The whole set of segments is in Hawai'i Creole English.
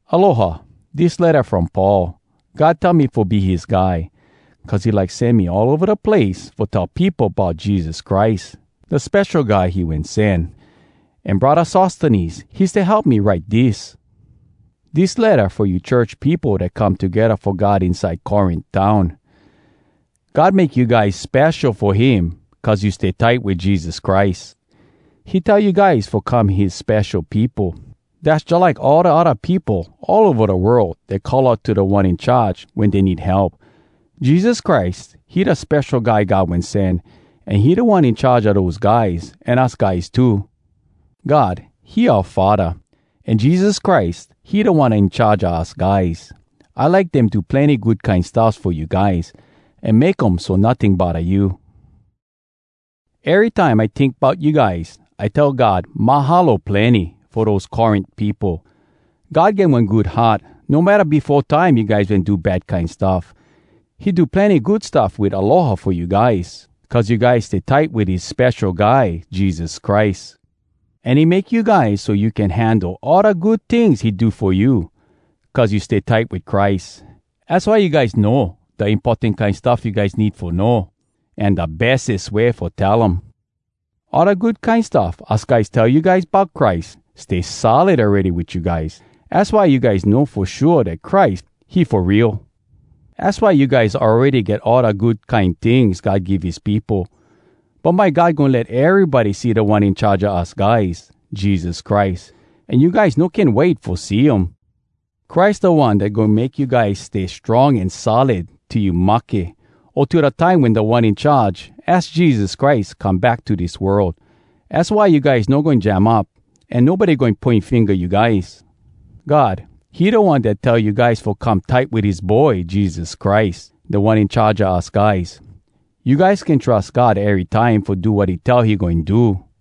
Aloha! Dis letta from Paul. God tell me fo be his guy, cuz he like sen me all ova da place fo tell peopo bout Jesus Christ, da Spesho Guy he wen sen. An Braddah Sostenes, he stay help me write dis. Dis letta fo you church peopo dat come togedda fo God inside Corint town. God make you guys spesho fo him cuz you stay tight wit Jesus Christ. He tell you guys fo come his spesho peopo! Dass jalike all da odda peopo all ova da world dat call out to Da One In Charge wen dey need help. Jesus Christ, he da Spesho Guy God Wen Sen, an he Da One In Charge a dose guys an us guys too. God, he oua Faddah, an Jesus Christ, he Da One In Charge a us guys. I like dem do plenny good kine stuffs fo you guys, an make um so notting bodda you. Erytime I tink bout you guys, I tell God “Mahalo plenny fo dose Corint peopo!” God get one good heart, no matta befo time you guys wen do bad kine stuff. He do plenny good stuff wit aloha fo you guys, cuz you guys stay tight wit his Spesho Guy Jesus Christ. An he make you guys so you can handle all da good tings he do fo you, cuz you stay tight wit Christ. Az why you guys know da importan kine stuff you guys need fo know, an da bestes way fo tell um. All da good kine stuff us guys tell you guys bout Christ, stay solid awready wit you guys. Az why you guys know fo shua dat Christ, he fo real. Az why you guys awready get all da good kine tings God give his peopo. Bumbye God goin let erybody see Da One In Charge a us guys, Jesus Christ. An you guys no can wait fo see um! Christ da One dat goin make you guys stay strong an solid till you mahke, o till da time wen Da One In Charge, az Jesus Christ, come back to dis world. Az why you guys no goin jam up, an nobody goin poin finga you guys. God, he da One dat tell you guys fo come tight wit his Boy Jesus Christ, Da One In Charge a us guys. You guys can trus God erytime fo do wat he tell he goin do.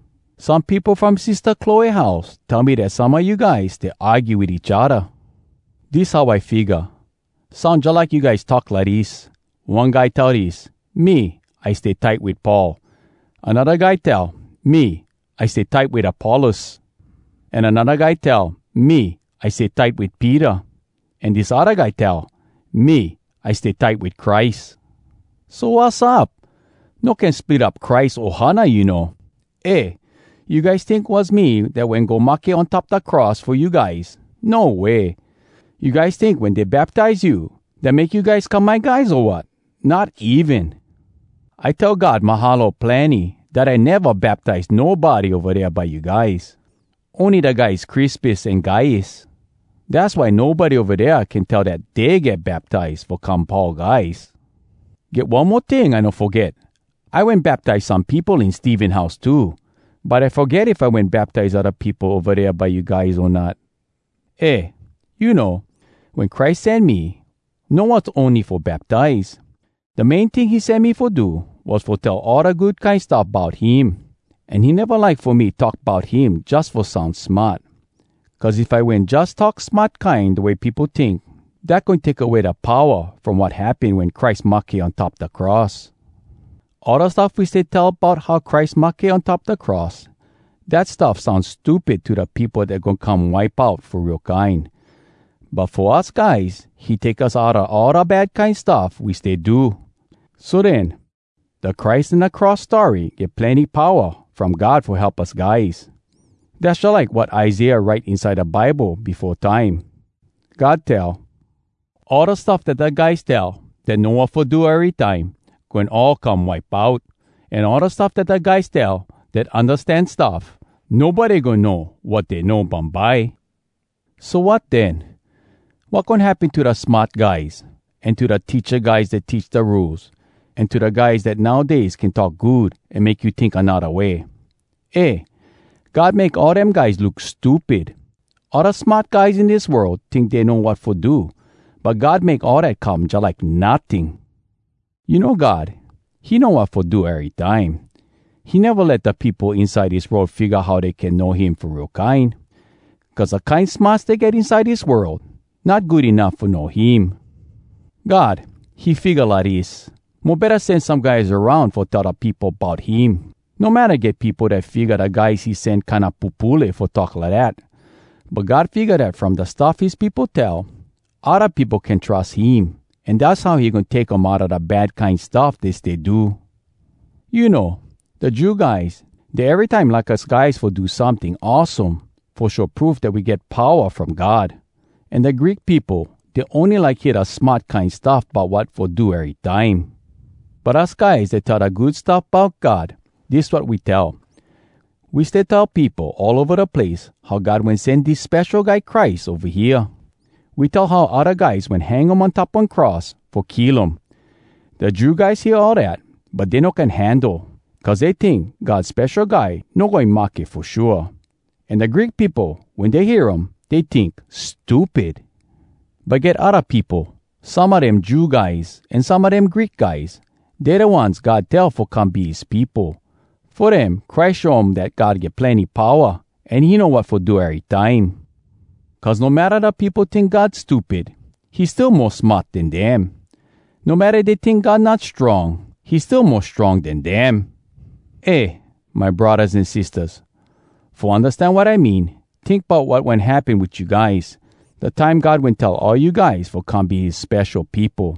Some peopo from Sistah Cloe house tell me dat some a you guys stay argue wit each odda. Dis how I figga. Soun jalike you guys talk lidis: One guy tell dis, “Me, I stay tight wit Paul!” Anodda guy tell, “Me, I stay tight wit Apollos!” An anodda guy tell, “Me, I stay tight wit Peter!” An dis odda guy tell, “Me, I stay tight wit Christ!” So, wassup? No can split up Christ ohana, you know! Eh! You guys tink was me dat wen go mahke on top da cross fo you guys? No way! You guys tink wen dey baptize you, dat make you guys come my guys, o wat? Not even! I tell God “Mahalo plenny” dat I neva baptize nobody ova dea by you guys. Ony da guys Crispus an Gaius. Dass why nobody ova dea can tell dat dey get baptize fo come Paul guys. —Get one mo ting I no foget: I wen baptize some peopo in Stephen house too. But I foget if I wen baptize odda peopo ova dea by you guys, o not. Eh, you know, wen Christ sen me, no was ony fo baptize! Da main ting he sen me fo do, was fo tell all da Good Kine Stuff Bout Him! An he neva like fo me talk bout him jus fo soun smart. Cuz if I wen jus talk smart kine da way peopo tink, dat goin take away da powa from wat happen wen Christ mahke on top da cross. All da stuff we stay tell bout how Christ mahke on top da cross, dat stuff soun stupid to da peopo dat goin come wipe out fo real kine. But fo us guys, he take us outa all da bad kine stuff we stay do. So den, da Christ an da cross story get plenny powa from God fo help us guys. Dass jalike wat Isaiah write inside da Bible befo time: God tell, “All da stuff dat da guys tell Dat know wat fo do erytime, Goin all come wipe out. An all da stuff dat da guys tell Dat undastan stuff, Nobody goin know wat dey know bumbye.” So wat den? Wat goin happen to da smart guys? An to da teacha guys dat teach da Rules? An to da guys dat nowdays can talk good an make you tink anodda way? Eh! God make all dem guys look stupid! All da smart guys in dis world tink dey know wat fo do, but God make all dat come jalike notting! You know God, he know wat fo do erytime. He neva let da peopo inside dis world figga how dey can know him fo real kine. Cuz da kine smarts dey get inside dis world, not good enuff fo know him. God, he figga lidis: Mo betta sen some guys aroun fo tell da peopo bout him, no matta get peopo dat figga da guys he sen kinda pupule fo talk lidat. But God figga dat from da stuff his peopo tell, odda peopo can trus him, an dass how he goin take um outa da bad kine stuff dey stay do. You know, da Jew guys, dey erytime like us guys fo do someting awesome fo show proof dat we get powa from God. An da Greek peopo, dey ony like hear da smart kine stuff bout wat fo do erytime. But us guys dat tell da Good Stuff Bout God, dis wat we tell. We stay tell peopo all ova da place how God wen sen dis Spesho Guy Christ ova hea. We tell how odda guys wen hang um on top one cross fo kill um. Da Jew guys hear all dat, but dey no can handle, cuz dey tink God Spesho Guy no goin mahke fo shua. An da Greek peopo, wen dey hear um, dey tink, “Stupid!” But get odda peopo, some a dem Jew guys an some a dem Greek guys, dey da ones God tell fo come be his peopo. Fo dem, Christ show um dat God get plenny powa an he know wat fo do erytime. Cuz no matta da peopo tink God stupid, he still mo smart den dem. No matta dey tink God not strong, he still mo strong den dem! Eh, my braddahs an sistahs! Fo undastan wat I mean, tink bout wat wen happen wit you guys, da time God wen tell all you guys fo come be his spesho peopo.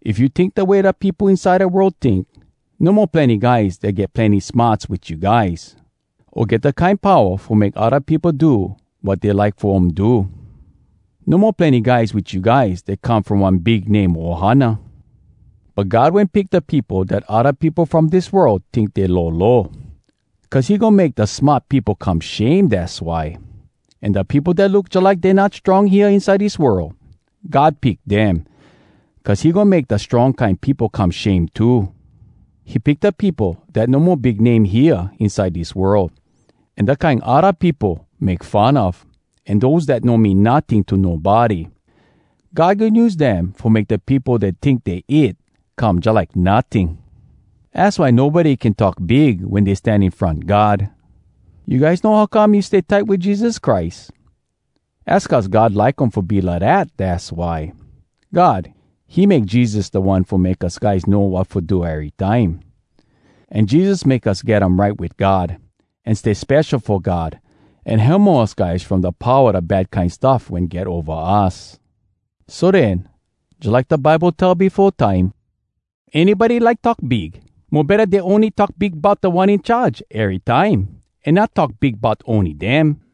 If you tink da way da peopo inside da world tink, no mo plenny guys dat get plenny smarts wit you guys, o get da kine powa fo make odda peopo do wat dey like fo um do. No mo plenny guys wit you guys dat come from one big name ohana. But God wen pick da peopo dat odda peopo from dis world tink dey lolo. Cuz he goin make da smart peopo come shame, dass why. An da peopo dat look jalike dey not strong hea inside dis world, God pick dem, cuz he goin make da strong kine peopo come shame too. He pick da peopo dat no mo big name hea inside dis world, an da kine odda peopo make fun of, an dose dat no mean notting to nobody. God goin use dem fo make da peopo dat tink dey it, come jalike notting. Az why nobody can talk big wen dey stan in front God. You guys know how come you stay tight wit Jesus Christ? Az cuz God like um fo be lidat, dass why! God, he make Jesus da One fo make us guys know wat fo do erytime. An Jesus make us get um right wit God, an stay spesho fo God, an hemo us guys from da powa da bad kine stuff wen get ova us! So den, jalike da Bible tell befo time: “Anybody like talk big, mo betta dey ony talk big bout Da One In Charge erytime, an not talk big bout ony dem!”